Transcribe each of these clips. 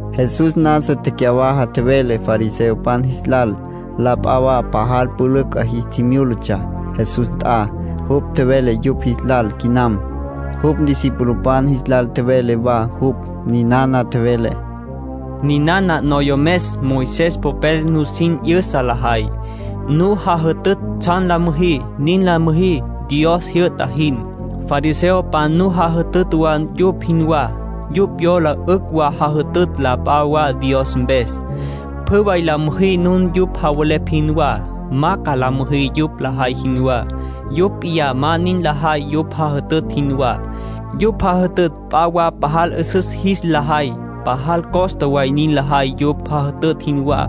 Jesús nasa tecyawaja tjevele fariseopan jis lal. La p'a wa pajal pülücj 'a jis tjimyúlatsja Jesús nt'a. Jupj tjevele yupj jis lal quinam. Jupj discipulopan jis lal tjevele wa jupj. Ninana tjevele: “Ninana noyomes Moisés popel nusin 'yüsa lajay. Nu jajütütj tsjan la müjí, nin la müjí Dios jyü'ta jin. Fariseopan nu jajütütj wa yupj jinwá. Yupj yola 'ücj wa jajütütj la p'a wa Dios mpes. Pjü way la müjí nun yupj javelepj jinwá. Ma ca la müjí yupj lajay jinwá. Yupj p'iyá ma nin lajay yupj jajütütj jinwá. Yupj jajütütj p'a wa pajal 'üsüs jis la jay. Pajal costa way nin lajay yupj jajütütj jinwá.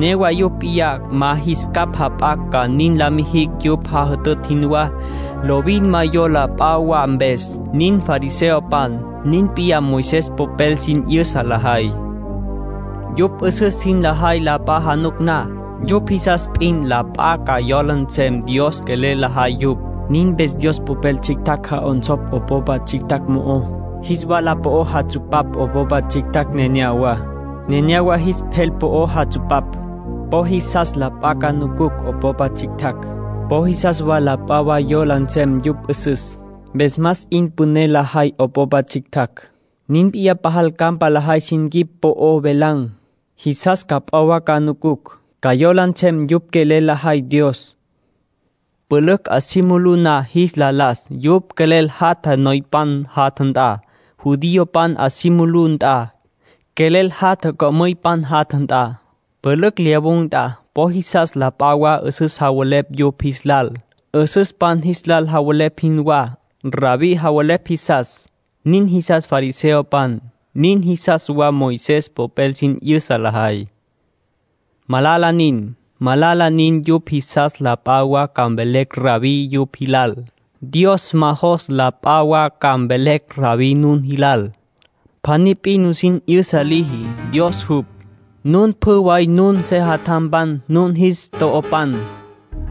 Newa yupj p'iyá ma jis capj jap'acj ca nin la mijicj yupj jajütütj jinwá. Lovin ma yola p'a wa mpes. Nin fariseopan. Nin p'iyá Moisés popel sin 'yüsa lajay. ”Yupj 'üsüs jin lajay la p'a januc na. Yupj jisas p'in la p'a ca yola nsem Dios quelel lajay yupj. Nin mpes Dios Popel tsjictjacj ja'onsopj 'opopa tsjictjacj mo'ó. Jis wala po'ó jatsupapj 'opopa tsjictjacj neneyawá, nenéyawa jis pjel po'ó jatsupapj. Po jisas la p'a ca nucucj 'opopa tsjictjacj. Po jisas wa la p'a wa yola nsem yupj 'üsüs, mpes más 'in püné lajay 'opopa tsjictjacj. Nin p'iyá pajal campa lajay sin quip po'o velan̈. Jisas ca p'a wa ca nucucj, ca yola nsem yupj quelel lajay Dios. Pülücj 'a si mulú na jis la las, yupj quelel jatja noypan jatja nt'a. Judiopan 'a si mulú nt'a, quelel jatja co'müypan jatja nt'a. Pülücj lyawun̈ nt'a, po jisas la p'a wa 'üsüs javelepj yupj jis lal, 'üsüspan jis lal javelepj jinwá. ‘Rabbí’ javelepj jisas. Nin jisas fariseopan. Nin jisas wa Moisés popel sin 'yüsa lajay. ”Malala nin. Malala nin yupj jisas la p'a wa ca mvelecj ‘Rabbí’ yupj jilal. Dios ma jos la p'a wa ca mvelecj ‘Rabbí’ nun jilal. Pjaní p'in nusin 'yüsa liji, Dios jupj. Nun pjü way nun sejatjampan, nun jis to'opan.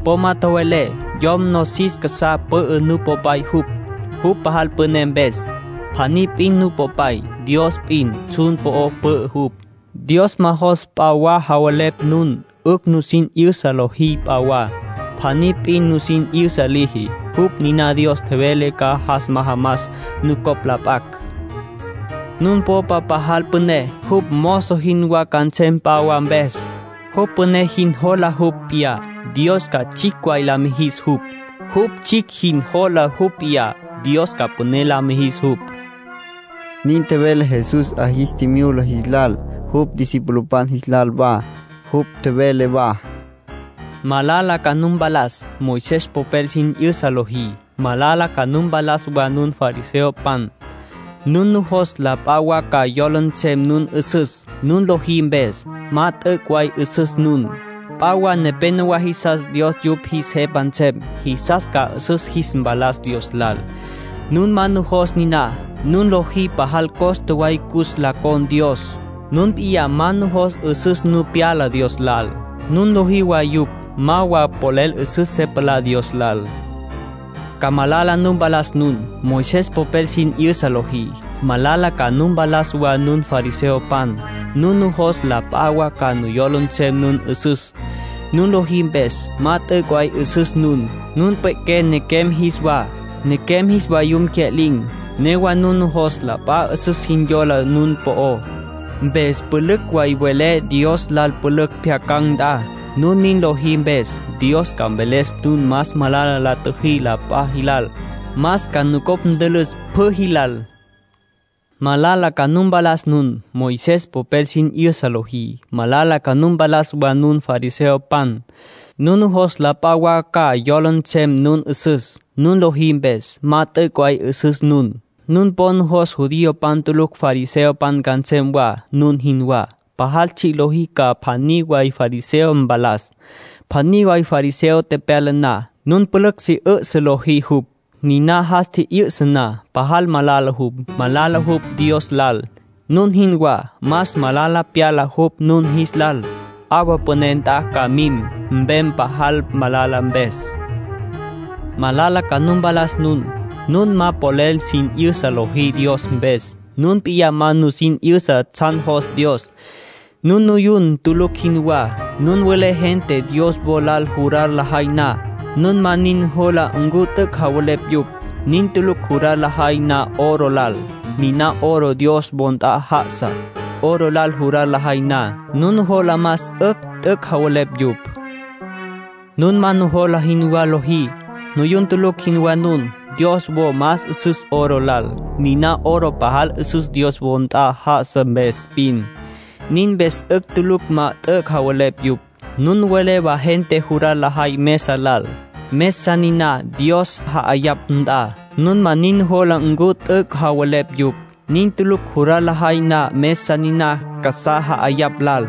Po ma tjowelé yom nosis casá pü'ü nupopay jupj, jupj pajal püné mpes. Pjaní p'in Nupopay. Dios p'in. Tsjun po'o pü'ü jupj. Dios ma jos p'a wa javelepj nun 'ücj sin 'yüsa lojí p'a wa. Pjaní p'in nusin 'yüsa liji. Jupj niná Dios tjevele ca jas majamas nucopj la p'acj. Nun popa pajal püné, jupj mozo jinwá ca nsem p'a wa mpes. Jupj püné jin jola jupj p'iyá, Dios ca tsjicj way la mijis jupj. Jupj tsjicj jin jola jupj p'iyá, Dios ca püné la mijis jupj”, nin tjevele Jesús 'a jis tjimyula jis lal, jupj discipulopan jis lal wa. Jupj tjevele wa: “Malala ca nu mpalas, Moisés popel sin 'yüsa lojí. Malala ca nu mpalas wa nun fariseopan. Nun nujos la p'a wa ca yola nsem nun 'üsüs, nun lojí mpes. Ma t'üc' way 'üsüs nun. P'a wa nepenowá jisas Dios yupj jis Jepa nsem. Jisas ca 'üsüs jis mpalas Dios lal. Nun ma nujos niná. Nun lojí pajal costa way cus la con̈ Dios. Nun p'iyá ma nujos 'üsüs nu pyala Dios lal. Nun lojí wa yupj ma wa polel 'üsüs se palá Dios lal. ”Ca malala nu mpalas nun, Moisés popel sin 'yüsa lojí. Malala ca nu mpalas wa nun fariseopan. Nun nujos la p'a wa ca yola nsem nun 'üsüs, nun lojí mpes. Ma t'üc' way 'üsüs nun. Nun pwe'qué nequem jis wa, nequem jis vayum tecya'lin̈. Newa nun nujos la p'a 'üsüs jin yola nun po'ó, mpes pülücj way welé Dios lal pülücj pjyacan̈ nt'a. Nun nin lojí mpes, Dios ca mveles nun más malala la tjüjí la p'a jilal. Más ca nucopj ntülüs pjü jilal. ”Malala ca nu mpalas nun, Moisés popel sin 'yüsa lojí. Malala ca nu mpalas wa nun fariseopan. Nun nujos la p'a wa ca yola nsem nun 'üsüs, nun lojí mpes. Ma t'üc' way 'üsüs nun. Nun po nujos judiopan tulucj fariseopan ca nsem wa, nun jinwá. Pajal tsji' lojí ca pjaní way fariseo mpalas. Pjaní way fariseo tepyala na, nun pülücj si 'üsǘ lojí jupj. Niná jas tji'yüsa na, pajal malala jupj. Malala jupj Dios lal, nun jinwá. Más malala pyala jupj nun jis lal. 'Awa püné nt'a ca mim, mpem, pajal malala mpes. ”Malala ca nu mpalas nun. Nun ma polel sin 'yüsa lojí Dios mpes. Nun p'iyá ma nusin 'yüsa tsjan jos Dios. Nun nuyun tulucj jinwá. Nun welé gente Dios wo lal jurar lajay na, nun ma nin nujola ncu t'üc' javelepj yupj. Nin tulucj jurar lajay na oro lal, niná oro Dios wo nt'a ja'asá. Oro lal jurar lajay na, nun nujola más 'ücj t'üc' javelepj yupj. Nun ma nujola jinwá lojí. Nuyun tulucj jinwá nun. Dios wo más 'üsüs oro lal. Niná oro pajal 'üsüs Dios wo nt'a já'asa mpes p'in. Nin mpes 'ücj tulucj ma t'üc' javelepj yupj. Nun welé wa gente jurar lajay mesa lal, mesa niná Dios ja'ayapj nt'a, nun ma nin nujola ncu t'üc' javelepj yupj. Nin tulucj jurar lajay na mesa niná casá ja'ayapj lal.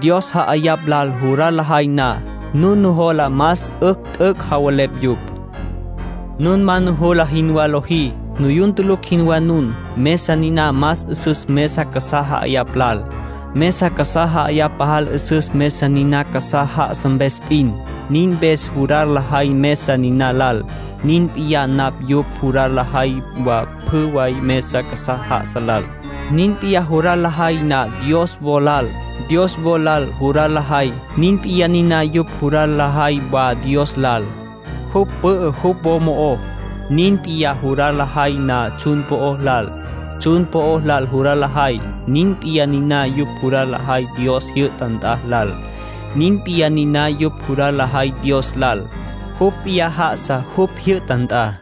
Dios ja'ayapj lal jurar lajay na, nun nujola más 'ücj t'üc' javelepj yupj. Nun ma nujola jinwá lojí. Nuyun tulucj jinwá nun. Mesa niná más 'üsüs mesa casá ja'ayapj lal. Mesa casá ja'ayapj pajal 'üsüs mesa niná casá já'asa mpes p'in. Nin mpes jurar lajay mesa niná lal, nin p'iyá niná yupj jurar lajay wa pjü way mesa casá já'asa lal. Nin p'iyá jurar lajay na Dios wo lal. Dios wo lal jurar lajay, nin p'iyá niná yupj jurar lajay wa Dios lal. Jupj pü'ü jupj wo mo'ó. Nin p'iyá jurar lajay na tsjun po'ó lal. Tsjun po'o lal jurar lajay, nin p'iyá niná yupj jurar lajay Dios jyü'ta nt'a lal. Nin p'iyá niná yupj jurar lajay Dios lal. Jupj p'iyá já'asa jupj jyü'ta nt'a.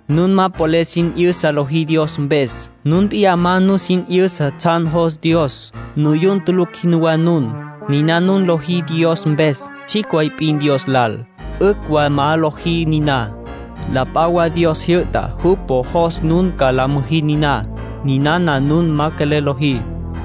Nun ma polel sin 'yüsa lojí Dios mpes. Nun p'iyá ma nusin 'yüsa tsjan jos Dios. Nuyun tulucj jinwá nun. Niná nun lojí Dios mpes, tsjicj way p'in Dios lal. 'Ücj wa ma lojí niná. La p'a wa Dios tjijyü'ta jupj po jos nun ca la müjí niná. Ninana nun ma quelel lojí.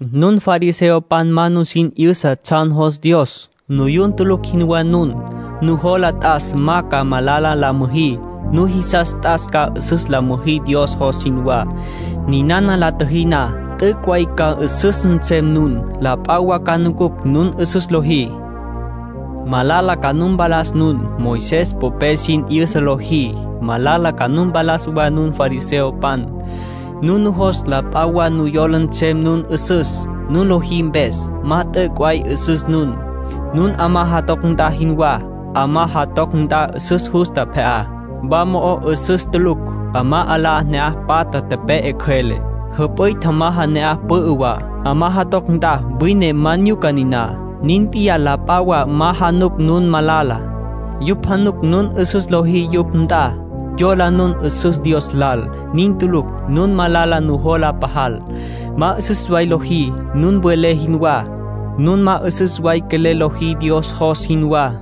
Nun fariseopan ma nusin 'yüsa tsjan jos Dios. Nuyun tulucj jinwá nun. Nujola t'as ma ca malala la müjí. Nujisas t'as ca 'üsüs la müjí Dios jos jinwá. Ninana la tjüjí na, t'üc' way ca 'üsüs nsem nun. La p'a wa ca nucucj nun 'üsüs lojí. ”Malala ca nu mpalas nun, Moisés popel sin 'yüsa lojí. Malala ca nu mpalas wa nun fariseopan. Nun nujos la p'a wa ca yola nsem nun 'üsüs, nun lojí mpes. Ma t'üc' way 'üsüs nun. Nun 'amá jatoc nt'a jinwá. 'Amá jatoc nt'a 'üsüs justa pje'á. Wa mo'ó 'üsüs tulucj. 'Amá 'ala'á ne'aj patja tepe'e cjüele. Jüp'üy tjamaja ne'aj pü'ü wa. 'Amá jatoc nt'a wine ma nyuca niná. Nin p'iyá la p'a wa ma januc nun malala. Yupj januc nun 'üsüs lojí yupj nt'a. Yola nun 'üsüs Dios lal. Nin tulucj. Nun malala nujola pajal. Ma 'üsüs way lojí, nun welé jinwá. Nun ma 'üsüs way quelel lojí Dios jos jinwá.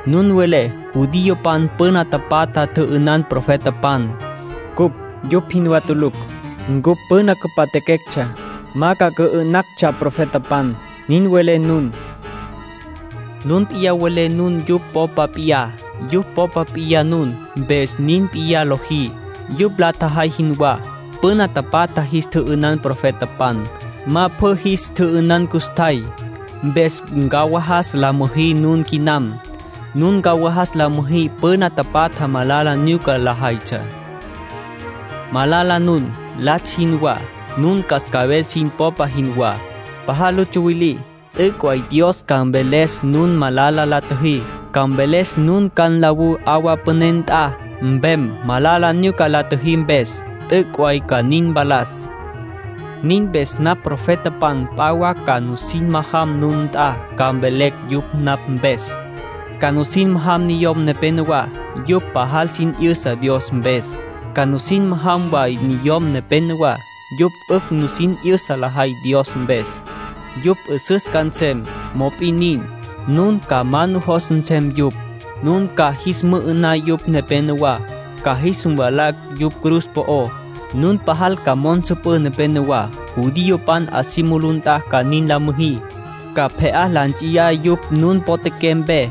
Nun welé: ‘Judiopan püna tapatja tjü'ünan profetapan. Cupj yupj jinwá tulucj. Ncupj püna cüpatjaquectsja, ma ca cü'ü'nactsja profetapan’, nin welé nun. Nun p'iyá welé nun yupj popa p'iyá. Yupj popa p'iyá nun, mpes nin p'iyá lojí, yupj la tjajay jinwá. Püna tapatja jis tjü'ünan profetapan. Ma pjü jis tjü'ünan custjay. Mpes ncawajas la müjí nun quinam. Nun ncawajas la müjí püna tapatja malala nyuca lajaytsja. ”Malala nun, latsj jinwá. Nun cascabel sin popa jinwá. Pajal lu tsuwilí. T'üc' way Dios ca mveles nun malala la tjüjí. Ca mveles nun ca nlawú 'awa püné nt'a, mpem, malala nyuca la tjüjí mpes. T'üc' way ca nin mpalas. Nin mpes napj profetapan p'a wa ca sin majam nun nt'a, ca mvelecj yupj napj mpes. Ca sin majam niyom nepenowá, yupj pajal sin 'yüsa Dios mpes. Ca sin majam wa niyom nepenowá, yupj 'ücj nusin 'yüsa lajay Dios mpes. Yupj 'üsüs ca nsem, mop'in nin, nun ma ca nujos nsem yupj. Nun ca jis mü'ü'ná yupj nepenowá, ca jis mvalá yupj cruz po'ó. Nun pajal ca mo'o nsüpǘ nepenowá. Judiopan 'a si mulú nt'a ca nin la müjí. Ca pje'á la nts'iyá yupj nun potjaqué mpe.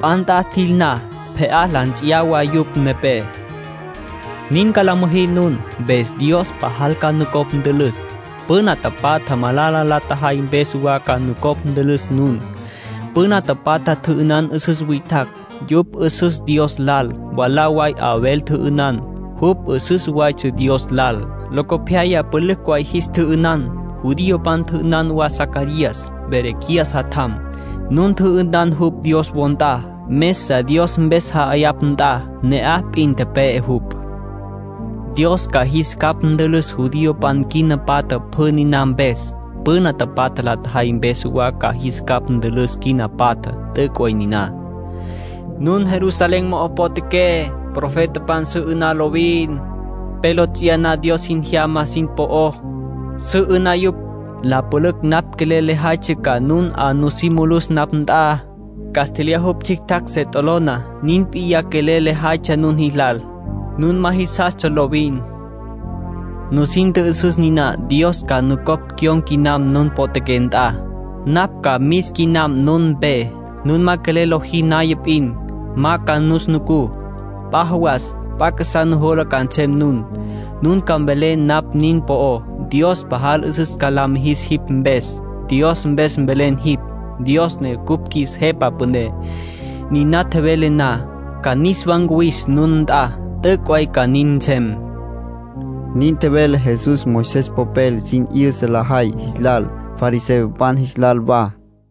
P'a nt'a jil na, pje'á la nts'iyá wa yupj nepé. Nin ca la müjí nun, mpes Dios pajal ca nucopj ntülüs. Püna tapatja malala la tjajay mpes wa ca nucopj ntülüs nun. Püna tapatja tjü'ünan 'üsüs witjacj, yupj 'üsüstsja Dios lal. Mwalá way Abel tjü'ünan. Jupj 'üsüs waytsja Dios lal. Locopyaya pülücj way jis tjü'ünan. Judiopan tjü'ünan wa Zacarías, Berequías jatjam. Nun tjü'ünan jupj Dios wo nt'a. Mesa Dios mpes ja'ayapj nt'a ne'aj p'in tepe'e jupj. Dios ca jis capj ntülüs judiopan quina patjá pjü niná mpes. Püna tapatja la tjajay mpes wa ca jis capj ntülüs quina patjá. T'üc' way niná. ”Nun Jerusalén mo'o potjaqué, profetapan su 'ü'ná lovin. Pe lo ts'iyaná Dios sin tjejyama sin po'ó, su 'ü'ná yupj. La pülücj napj quelel lejaytsja ca nun 'a nusí mulus napj nt'a. Castlyaj jupj tsjictjacj se t'olona, nin p'iyá quelel lejaytsja nun jilal. Nun ma jisastsja lovin. Nusin tjü'üsüs niná. Dios ma nucopj cyon̈ca quinam nun potjaqué nt'a. Napj ca mis quinam nun mpe. Nun ma quelel la nojí naya p'in, ma ca nus nucú. P'a jawas p'a casá nujola ca nsem nun. Nun ca mvelé napj nin po'ó: ‘Dios pajal 'üsüs ca la mijis jipj mpes. Dios mpes velen jipj, Dios ne cupj qjuis Jepa Püné.’ Niná tjowelé na, ca niswa ncuwis nun nt'a. T'üc' way ca nin nsem”, nin tjevele Jesús Moisés popel sin 'yüsa lajay jis lal, fariseopan jis lal wa.